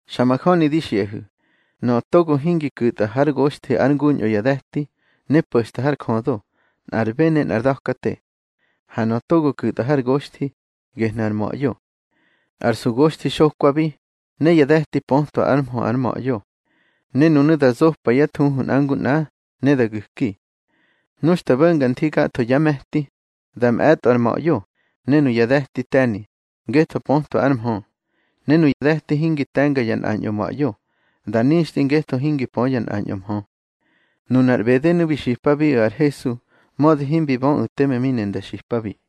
Xa majöni di xiꞌahu̱, nöꞌö togo hingi ku̱tꞌa hár goxthi ár nguñꞌo ya de̱ti, ne po̱xta har jödo, nꞌar bë ne ar da̱kate. Ha nöꞌö togo ku̱tꞌa har goxthi, gehnu̱ ar ma̱ꞌyo. Ar sugoxthi xokwabi, ne ya de̱ti pötwa ár mhö ar ma̱ꞌyo. Ne nunu̱ da zopa yá thuhu nꞌa ngu nꞌa, ne da gu̱ki. Nu xta bo̱nga nthi gatho yá me̱ti, da mꞌe̱tꞌo ar ma̱ꞌyo, ne nuya de̱ti te̱ni, ngetho pötwa ár mhö. Ne nuyá de̱ti hingi te̱nga ya nꞌañꞌo ma̱ꞌyo, da nixtꞌi ngetho hingi pö ya nꞌañꞌo mhö. Nunar ꞌbedenu̱ bi xipabiꞌu̱ ar Hesu, mödi himbi böꞌu̱ teme mi ne nda xipabi.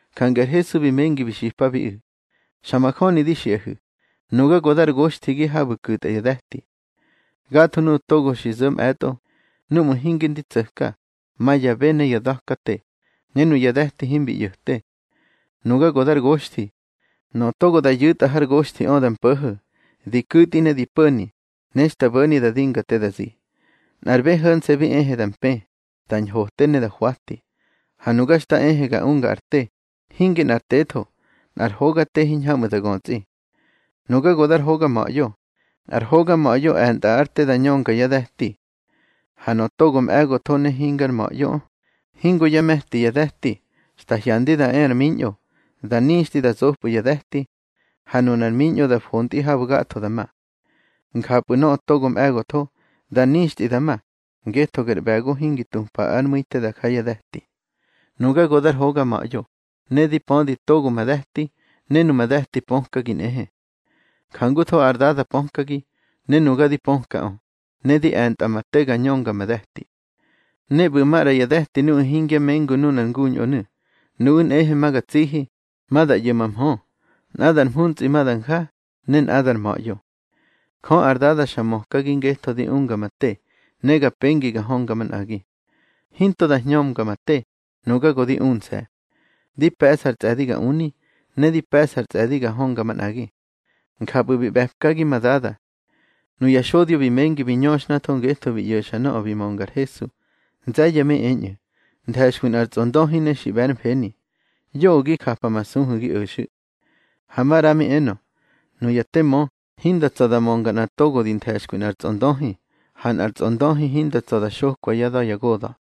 Jange ar Hesu bi mengi bi xipabiꞌu̱: —Xa majöni di xiꞌahu̱, nuga go dar goxthigi habu̱ ku̱tꞌa ya de̱ti. Gatho nuꞌu̱ togo xi zo̱ mꞌe̱tꞌo, núꞌmu̱ hinge ndi tso̱tka, ma ya bë ne ya da̱kate, ne nuya de̱ti himbi ꞌyo̱te. Nuga go dar goxthi. Nöꞌö togo da yu̱tꞌa har goxthiꞌö da mpo̱ho̱, di ku̱tꞌi ne di po̱ni, ne xta bo̱ni da dinga te da zi. Nꞌar bë ho̱nse̱ bi ehe da mpë, da ñhote ne da hwati. Ha nuga xta ehe ga unga ar te, hinge nꞌar tetho, nꞌar hoga te hiñhamꞌu̱ da götsꞌi. Nuga go dar hoga ma̱ꞌyo. Ar hoga ma̱ꞌyo e̱ntꞌa ár te da ñönga yá de̱ti. Ha nöꞌö togo mꞌe̱gotho ne hingar ma̱ꞌyoꞌö, hingo yá me̱ti ya de̱ti, xta hyandi da e ar miñꞌo, da nixtꞌi da zopꞌu̱ ya de̱ti. Ha nunar miñꞌo da fontꞌi habu̱ gatho da ma. Njapꞌu̱ nöꞌö togo mꞌe̱gotho, da nixtꞌi da ma, ngetho ger ꞌbe̱go hingi tupa ár mu̱i te da ja ya de̱ti. Nuga go dar hoga ma̱ꞌyo, ne di pödi togo ma de̱ti, ne numa de̱ti pökagi nꞌehe. Jangutho ar Dada pökagi, ne nuga di pökaꞌö, ne di e̱ntꞌa ma te ga ñönga ma de̱ti. Ne ꞌbu̱ maꞌra ma de̱ti nuꞌu̱ hingya mengu nunar nguñꞌonu̱. Nuꞌu̱ nꞌehe ma ga tsihi, ma da ꞌyo̱ ma mhö. Nꞌadar mhuntsꞌi ma da nja, ne nꞌadar ma̱ꞌyo. Jö ar Dada xa mökagi ngetho di unga ma te, ne ga pengi ga hönga manꞌagi. Hinto da hñömga ma te, nuga go di unse̱. Di pe̱ꞌsa ar tsꞌe̱di ga uni, ne di pe̱ꞌsa ar tsꞌe̱di ga hönga manꞌagi. Njapꞌu̱ bi ꞌbe̱pkagi ma Dada. Nuya xodyo bi mengi bi ñöxhnatho ngetho bi ꞌyo̱xa nöꞌö bi mönga ar Hesu. Nze̱ye̱ mi eñꞌu̱: —Nthe̱xkwi nꞌar tsꞌondöhi ne xi ꞌbe̱ ár mfeni. Yoꞌö gi japamasuhu̱ gi o̱xu̱. Ha maꞌra mi enö: —Nuya te mö, hinda tsa̱ da mönga nꞌa togo di nthe̱xkwi nꞌar tsꞌondöhi. Ha nꞌar tsꞌondöhi hinda tsa̱ da xokwa yá da̱ ya goda̱.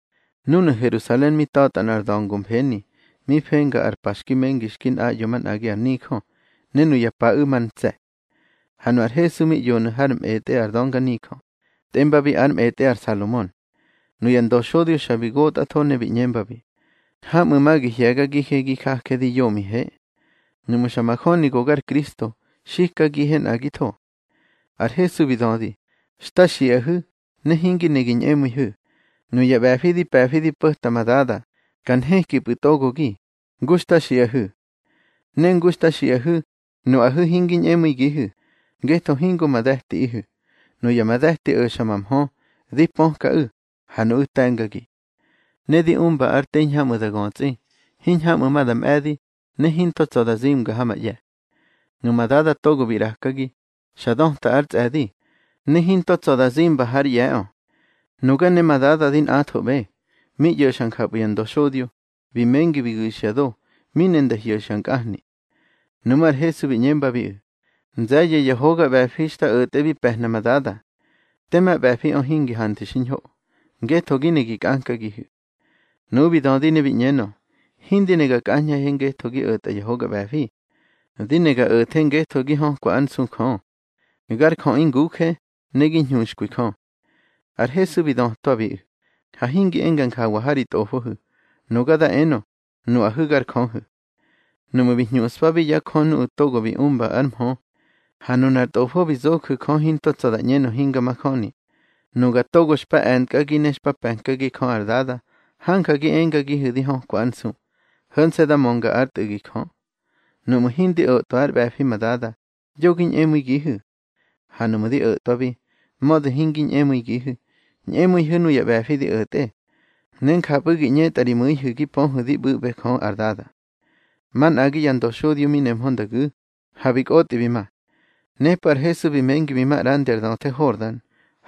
Núnu̱ Herusalen mi ta̱tꞌa nꞌar da̱ngo mfeni, mi fenga ar pa xki mengi xki nꞌaꞌyo manꞌagi ar nijö, ne nuya paꞌu̱ mar ntse̱. Ha nu ar Hesu mi ꞌyonu̱ hár mꞌetꞌe ar dönganijö, tꞌembabi ár mꞌetꞌe ar Salomon. Nuya ndöxodyo xa bi gotꞌatho ne bi ꞌñembabi: —Hamꞌu̱ ma gi hye̱gagihe gi jaje di yomihe. Nuꞌmu̱ xa majöni go gar Kristo, xikagihe nꞌagitho. Ar Hesu bi dödi: —Xta xiꞌahu̱, ne hingi ne gi ñꞌemu̱ihu̱. Nuya ꞌbe̱fi di pe̱fi di po̱ta ma Dada, ka nhekipꞌu̱ togogi, ngu xta xiꞌahu̱. Ne ngu xta xiꞌahu̱, nuꞌahu̱ hingi ñꞌemu̱igihu̱, ngetho hingo ma de̱tiꞌihu̱. Nuya ma de̱ti o̱xa ma mhö. Di pökaꞌu̱, ha nuꞌu̱ te̱ngagi. Ne di umba ar te hiñhamꞌu̱ da götsꞌi, hiñhamꞌu̱ ma da mꞌe̱di, ne hinto tsa̱ da zimga ha ma ꞌye̱. Numa Dada togo bi ꞌrakagi, xa döta ár tsꞌe̱di, ne hinto tsa̱ da zimba hár ꞌye̱ꞌö. Nuga ne ma Dada di nꞌathoꞌbe. Mi ꞌyo̱xa njapꞌu̱ ya ndöxodyo, bi mengi bi gu̱xya do, mi ne nda hyo̱xya nkꞌahni. Nuꞌmú̱ ar Hesu bi ꞌñembabiꞌu̱: —Nze̱ye̱ ya hoga ꞌbe̱fi xta o̱tꞌe bi pe̱hna ma Dada. Tema ꞌbe̱fiꞌö hingi hanthu̱ xiñho, ngetho gi ne gi kꞌankagihu̱. Nuꞌu̱ bi dödi ne bi ꞌñenö: —Hindi ne ga kꞌañꞌahe ngetho gi o̱tꞌa ya hoga ꞌbe̱fi. Di ne ga o̱the ngetho gi hökwa ár nsu Jö. Gar jöꞌi nguje, ne gi ñhuxkwi Jö. Ar Hesu bi dötwabiꞌu̱: —Ha hingi enga njawa ha ri tꞌofohu̱: Nuga da enö: Nuꞌahu̱ gar jöhu̱. Nuꞌmu̱ bi hñuꞌspabi ya jö nuꞌu̱ togo bi umba ár mhö, ha nunar Tꞌofo bi zoju̱ Jö hinto tsa̱ da ꞌñenö hinga majöni, nuga togo xpa e̱ntkꞌagi ne xpa pe̱nkagi Jö ar Dada, hanja gi engagihu̱ di hökwa ár nsu, ho̱nse̱ da mönga ár Tꞌu̱gi Jö. Nuꞌmu̱ hindi o̱tꞌwa ár ꞌbe̱fi ma Dada, yo gi ñꞌemu̱igihu̱. Ha nuꞌmu̱ di o̱tꞌwabi, mödi hingi ñꞌemu̱igihu̱, ñꞌemu̱ihu̱ nuya ꞌbe̱fi di o̱tꞌe, ne njapꞌu̱ gi ꞌñetꞌa ri mu̱ihu̱ gi pöhu̱ di ꞌbu̱ꞌbe Jö ar Dada. Manꞌagi ya ndöxodyo mi nehmö nda gu̱, ha bi kꞌotꞌi bi ma. Nepꞌu̱ ar Hesu bi mengi bi ma ꞌrandi ar döthe Hordan,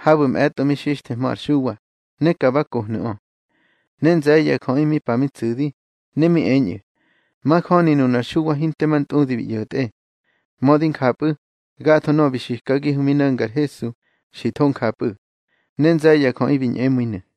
habu̱ mꞌe̱tꞌo mi xixthehmö ar Xuwa, ne ka ba kohnu̱ꞌö. Ne nze̱ye̱ ya jöꞌi mi pa mi tsu̱di, ne mi eñꞌu̱: —Majöni nunar Xuwa hinte ma ntꞌudi bi ꞌyo̱tꞌe. Mödi njapꞌu̱, gatho nöꞌö bi xikagihu̱ mi no̱nga ar Hesu, xi tho njapꞌu̱. Ne nze̱ye̱ ya jöꞌi bi ñꞌemu̱inu̱.